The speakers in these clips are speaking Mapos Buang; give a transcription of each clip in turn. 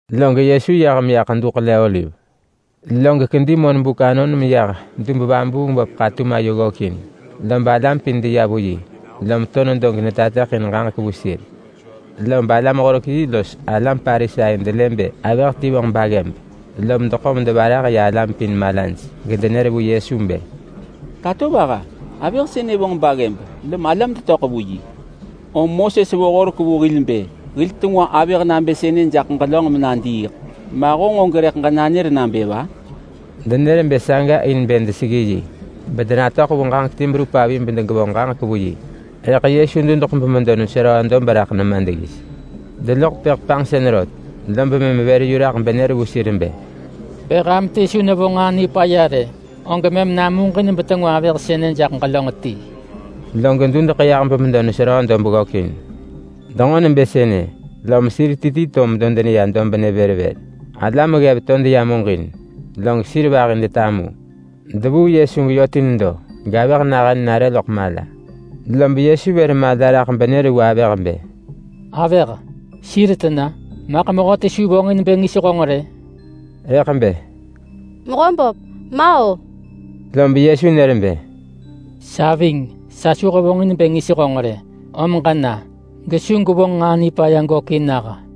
[Log Yesu yah meya Ḳedu Ḳele-oliv. Log kedi monbuk anon meyah dub-vabuung-böp ḳatum ayo ggökin. Lob alam pin deya vu yi, lom to nedo getateḳin ġaġek vu sir. Lob alam-horek-yi los alam Parisai delë bë avëh ti vonġ baggëb, lom deḳo medevarah ya alam pin malaj gedenër vu Yesu bë, “Tatovaha! Avëh sënë vonġ baggëb lom alam detöḳ vu yi. Moses vo horek vu hil bë hil tengwa avëh nabë sënë jaḳ ġelönġ menadiiḳ. Ma honġ og rëḳ ġenanër nabë va?” Denër bë saga in bë deseggi yi, bedenatöḳ vu ġaġek ti berup avi bedegevonġ ġaġek vu yi. Rëḳ Yesu dudeḳ bemedo neseröö dob raḳ nema deggis. Deloḳ tepëḳ panġsën rot, lob mëm vër yu raḳ benër vu sir bë, “Bë ham ti su nevonġ nġaa nipaya rë, og mëm namuġin betengwa avëh sënë jaḳ ġelönġ ti.” Log dudeḳ yah bemedo neseröö dob ggökin. Denġo nebë sënë, lom sir ti ti to medo deneya dobnë vër vër. Alam ggev to deya muġin, log sir vahi detamu. Devuu Yesu geyö ti nedo gavëh nahën nare loḳ mala. Lob Yesu vër mala raḳ benër vu avëh bë, “Avëh, sir tena? Maḳ mehöti su vonġin bë ngis honġ rë?” Rëḳ bë, “Mehöböp, ma-o!” Lob Yesu nër bë, “Sa ving, sa su hevonġin bë ngis honġ rë. Om ġena, gesu gwevonġ nġaa nipaya gökin nah!”]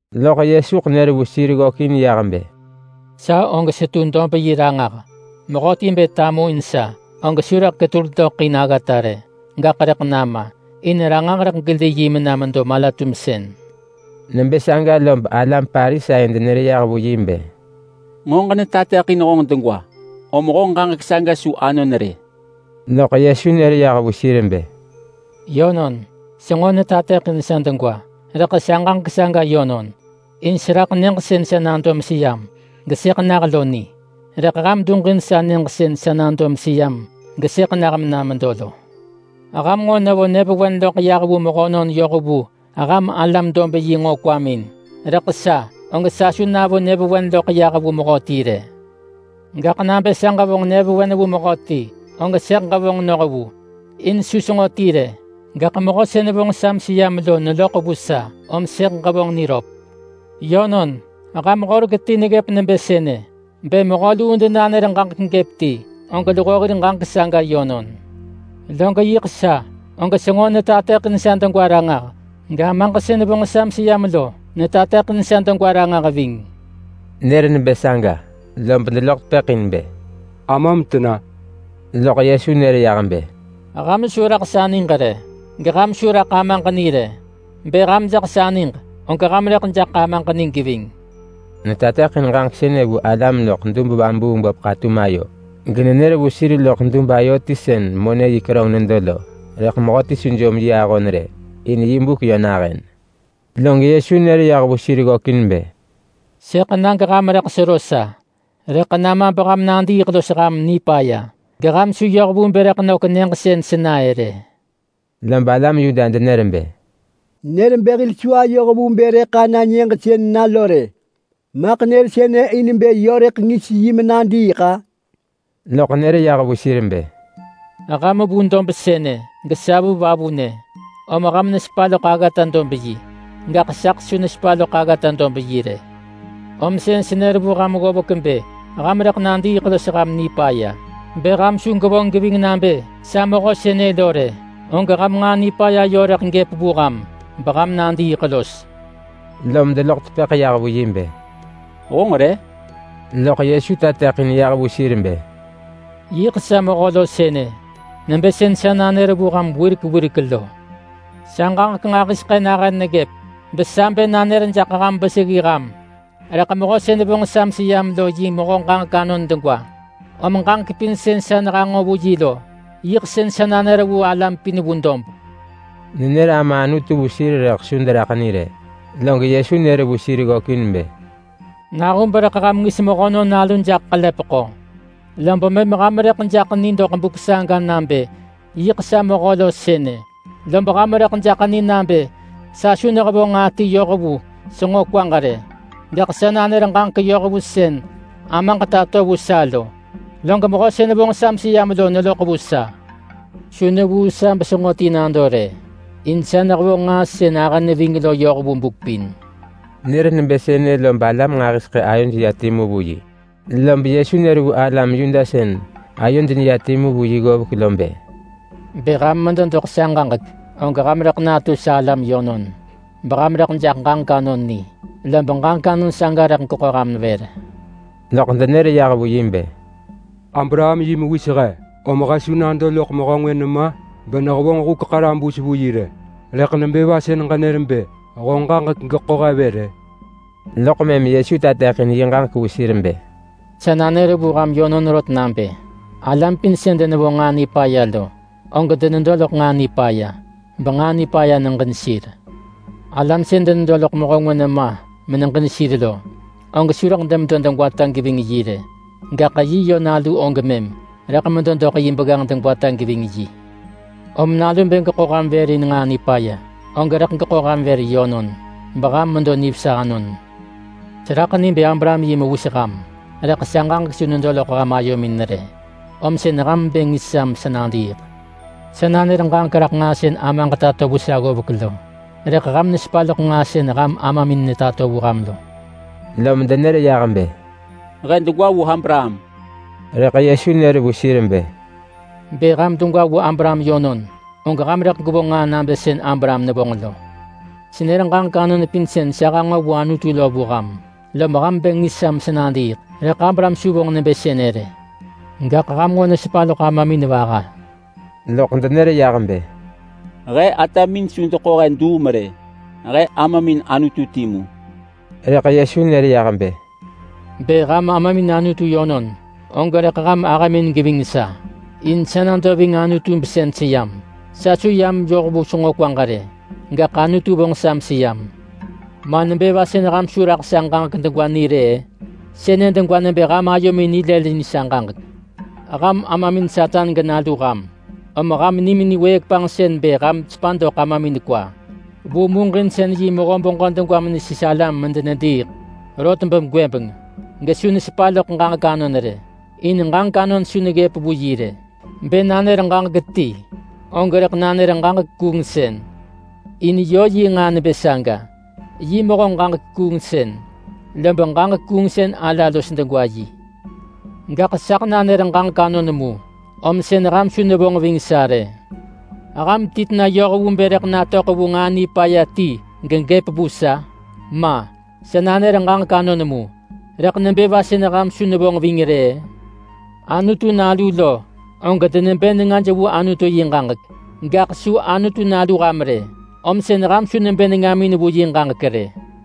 Lob Yesu nër vu sir ggökin yah bë, “Sa og setu dob yi ranġah. Mehöti bë tamuin sa, og su rëḳ ketul doḳ in aggata rë, gaḳ rëḳ nama. In ranġah rëḳ geli yi mena medo mala-tumsën.” Nebë saga lob alam Parisai denër yah vu yi bë, “Nġo ġenetateḳin honġ degwa, om honġ ġaġek saga su anon rë.” Loḳ Yesu nër yah vu sir bë, “Yönon, senġo netateḳin sa degwa. Rëḳ sa ġaġek saga yönon, in seraḳ nyëġ sën sa nado meseyam gesëḳ nah lo ni. Rëḳ ham duġin sa nyëġ sën sa nado meseyam gesëḳ nah mena medo lo. Ham nġo nevo nyëvewen loḳ yah vu mehönon yoh vu ham alam-dob-yi nġo kwamin, rëḳ sa, og sa su navo nyëvewen loḳ yah vu mehöti rë. Gaḳ nabë sa ġevonġ nyëvewen vu mehöti, og sëḳ ġevonġ noh vu, in su senġo ti rë. Gaḳ Mehö sën vonġ sa meseyam lo neloḳ vu sa, om sëḳ ġevonġ niröp. Yönon, ham horek ti neggëp nebë sënë: Bë mehö luu denanër ġaġek gëp ti, og luho hir ġaġek saga yönon. Log yiḳ sa, og senġo netateḳin sa degwa ranġah, gAmaġ sën vonġ sa meseyam lo netateḳin sa degwa ranġah ving.” Nër nebë saga lob deloḳ tepëḳ in bë, “Amam tena?” Loḳ Yesu nër yah bë, “Ham su raḳ sa niġ rë, geham su raḳ Amaġ ni rë. Bë ham jaḳ sa niġ, og ham rëḳ jaḳ Amaġ ni geving.” Netateḳin ġaġek sënë vu alam loḳ dub-vabuung-böp ḳatum ayo, genenër vu sir loḳ dub ayo ti sën monë ben lo rëḳ mehöti su jom yi ahon rë, in yi buk yö nahën. Log Yesu nër yah vu sir ggökin bë, “Sëḳ na geham rëḳ sero sa, rëḳ nama beham nadiiḳ los ham nipaya. Geham su yoh vu bë rëḳ nök nyëġ sën sena-ë rë.” Lob alam Yuda denër bë, “Nër bë hil su ayoh vu bë rëḳ ana nyëġ sën na lo rë! Maḳ nër sënë in bë yö rëḳ ngis yi menadiiḳ-a?” Loḳ nër yah vu sir bë, “Ham vu dob sënë, gesa vu vavunë. Om ham nesepa loḳ aggata-dob-yi, gaḳ saḳ su nesepa loḳ aggata-dob-yi rë. Om sën senër vu ham ggovek bë ham rëḳ nadiiḳ los ham nipaya. Bë ham su gwevonġ geving nabë sa Mehö sënë lo rë, og ham nġaa nipaya rëḳ gëp vu ham, beham nadiiḳ los.” Lom deloḳ tepëḳ yah vu yi bë, “Honġ re?” Loḳ Yesu tateḳin yah vu sir bë, “Yiḳ sa Mehö lo sënë, nebë sën sa nanër vu ham wirek wirek lo. Sa ġaġek nġahiseḳë nahën neggëp besa bë nanër jaḳ ham beseggi ham. Rëḳ Mehö sën vonġ sa meseyam lo yi Mehö ġaġek anon degwa, om ġaġek pin sën sa nehanġo vu yi lo, yiḳ sën sa nanër vu alam pin vu dob.” Nenër Ama Anutu vu sir rëḳ su deraḳ ni rë. Log Yesu nër vu sir ggökin bë, “Nahub rëḳ ham ngis Mehönon Nalu jaḳ ḳelepeḳo, lob mëm ham rëḳ jaḳ ni doḳ buk saga nabë yiḳ sa Mehö lo sënë. Lob ham rëḳ jaḳ ni nabë sa su nehevonġ nġaa ti yoh vu senġo kwaġ rë. Gaḳ sa nanër ġaġek yoh vu sën Amaġ tato vu sa lo. Log Mehö sën vonġ sa meseyam lo neloḳ vu sa. Su nevuu sa besenġo ti nado rë. In sa nehevonġ nġaa sën ahë neving lo yoh vu buk pin.” Nër nebë sënë lob alam nġahiseḳë ayoj ya timu vu yi. Lob Yesu nër vu alam Yuda sën ayoj neya timu vu yi ggovek lo bë, “Bë ham medo doḳ sa ġaġek, og ham rëḳ natu sa alam yönon, beham rëḳ jaḳ ġaġek anon ni, lob ġaġek anon saga rëḳ geḳo ham vër.” Loḳ denër yah vu yi bë, “Abraham yi mewis he, om he su nado loḳ mehö ngwë nema benehevonġ huk ḳarabus vu yi rë! Rëḳ nebë va sën ġenër bë honġ ġaġek rëḳ geḳo he vër-ë?” Loḳ mëm Yesu tateḳin yi ġaġek vu sir bë, “Sa nanër vu ham yönon rot nabë: Alam pin sën denevonġ nġaa nipaya lo, og denedo loḳ nġaa nipaya, benġaa nipaya neġin sir. Alam sën denedo loḳ mehö ngwë nema meneġin sir lo, og su rëḳ demedo degwata geving yi rë. Gaḳ yi yö nalu og mëm rëḳ medo doḳ yi begganġ degwata geving yi. Om Nalu bë geḳo ham vër in nġaa nipaya, og rëḳ geḳo ham vër yönon, beham medo nivesa anon. Seraḳ ni bë Abraham yi mewis ham! Rëḳ sa ġaġek su nedo loḳ ham ayomin rë, om sën ham bë ngis sa mesa nadiiḳ. Sa nanër ġaġek raḳ nġaa sën Amaġ tato vu sa ggovek lo, rëḳ ham nesepa loḳ nġaa sën ham amamin netato vu ham lo!” Lom denër yah bë, “He degwa vu Abraham!” Rëḳ Yesu nër vu sir bë, “Bë ham degwa vu Abraham yönon, og ham rëḳ gwevonġ nġaa nabë sën Abraham nevonġ lo. Senër ġaġek anon pin sën sa hanġo vu Anutu lo vu ham, lom ham bë ngis sa mesa nadiiḳ, rëḳ Abraham su vonġ nebë sënë rë. Gaḳ ham nġo nesepa loḳ amamin vaha!” Loḳ denër yah bë, “He atamin su deḳo he duum rë! He amamin Anutu timu.” Rëḳ Yesu nër yah bë, “Bë ham amamin Anutu yönon, og rëḳ ham ahëmin geving sa, in sa nado ving Anutu besën seyam. Sa su yam yoh vu senġo kwaġ rë, gaḳ Anutu vonġ sa meseyam. Ma nebë va sën ham su raḳ sa ġaġek degwa ni rë-ë? Sënë degwa nebë ham ayomin nilëlin sa ġaġek. Ham amamin Satan genalu ham, om ham nimin wëëk panġsën bë ham sepa doḳ amamin kwa. Vu muġinsën yi mehö beġö degwa menesis alam medenediiḳ. Rot begwëbeng. Gesu nesepa loḳ ġaġek anon rë, in ġaġek anon su neggëp vu yi rë. Bë nanër ġaġek ti, og rëḳ nanër ġaġek kuungsën, in yö yi nġaa nebë saga. Yi mehö ġaġek kuungsën, lob ġaġek kuungsën ala los degwa yi. Gaḳ saḳ nanër ġaġek anon mu, om sën ham su nevonġ ving sa rë. Ham ti tena yoh vu bë rëḳ natöḳ vu nġaa nipaya ti gegëp vu sa? Ma! Sa nanër ġaġek anon mu, rëḳ nebë va sën ham su nevonġ ving rë-ë? Anutu nalu lo, og denebë nengaj vu Anutu yi ġaġek. Gaḳ su Anutu nalu ham rë, om sën ham su nebë nengamin vu yi ġaġek rë.”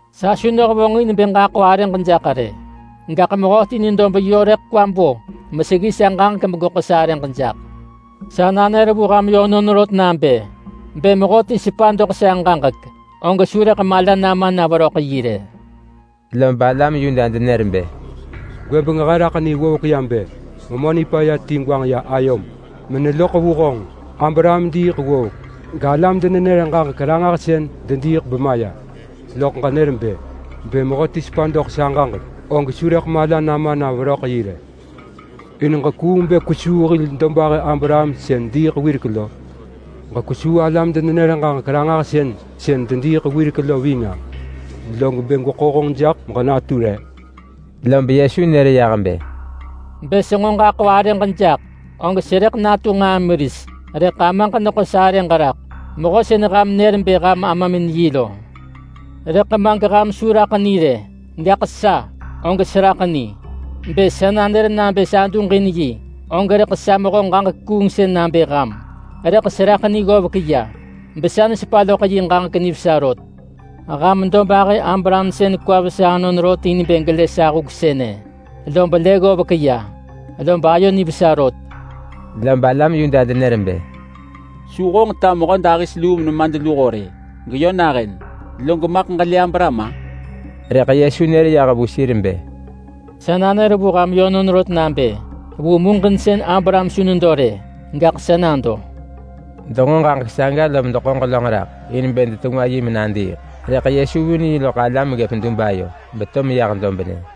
Sa su nehevonġin bë ġaḳo arëġ jaḳ rë. Gaḳ Mehöti nedo beyö rëḳ kwa bo meseggi sa ġaġek begeḳo sarëġ jaḳ. Sa nanër vu ham yönon rot nabë: Bë mehöti sepa doḳ sa ġaġek, og su rëḳ mala nama na veröḳ yi rë.” Lob alam Yuda denër bë, “Gwëbeng he raḳ ni ggovek ya bë memö nipaya ti gwanġ ya ayom meneloḳ vu honġ. Abraham diiḳ ggovek, galam-denenër-ġaġek-ranġahsën dediiḳ bemaya, loḳ ġenër bë, ‘Bë mehöti sepa doḳ sa ġaġek, og su rëḳ mala nama na veröḳ yi rë.’ In ġekuung bë kwesuu hil dobahë Abraham sën diiḳ wirek lo? Ġekwesuu alam-denenër-ġaġek-ranġahsën sën dediiḳ wirek lo ving-a? Log bë gweḳo honġ jaḳ meġenatu re?” Lob Yesu nër yah bë, “Bë senġo ġaḳo arëġ jaḳ, og serëḳ natu nġaa meris. Rëḳ Amaġ neḳo sarëġ raḳ, Mehö sën ham nër bë ham amamin yi lo. Rëḳ ma geham su raḳ ni rë. Gaḳ sa, og seraḳ ni. Bë sa nanër nabë sa duġin yi, og rëḳ sa mehö ġaġek kuungsën nabë ham. Rëḳ seraḳ ni ggovek ya besa nesepa loḳ yi ġaġek nivesa rot. Ham dobahë Abraham sën kwa vesa anon rot in bë gelë sa huk sënë, lob lë ggovek ya, lob ayo nivesa rot.” Lob alam Yuda denër bë, “Su honġ ta mehödahis luu menemadluho rë geyö nahën, log maḳ ġelë Abraham-a?” Rëḳ Yesu nër yah vu sir bë, “Sa nanër vu ham yönon rot nabë: Vu muġinsën gAbraham su nedo rë, vu buk saga sa nado.” Denġo ġaġek saga lom deḳo ġelönġ raḳ in bë detengwa yi menadiiḳ, rëḳ Yesu vun yi loḳ alam ggëp dub ayo, beto meyah dobnë.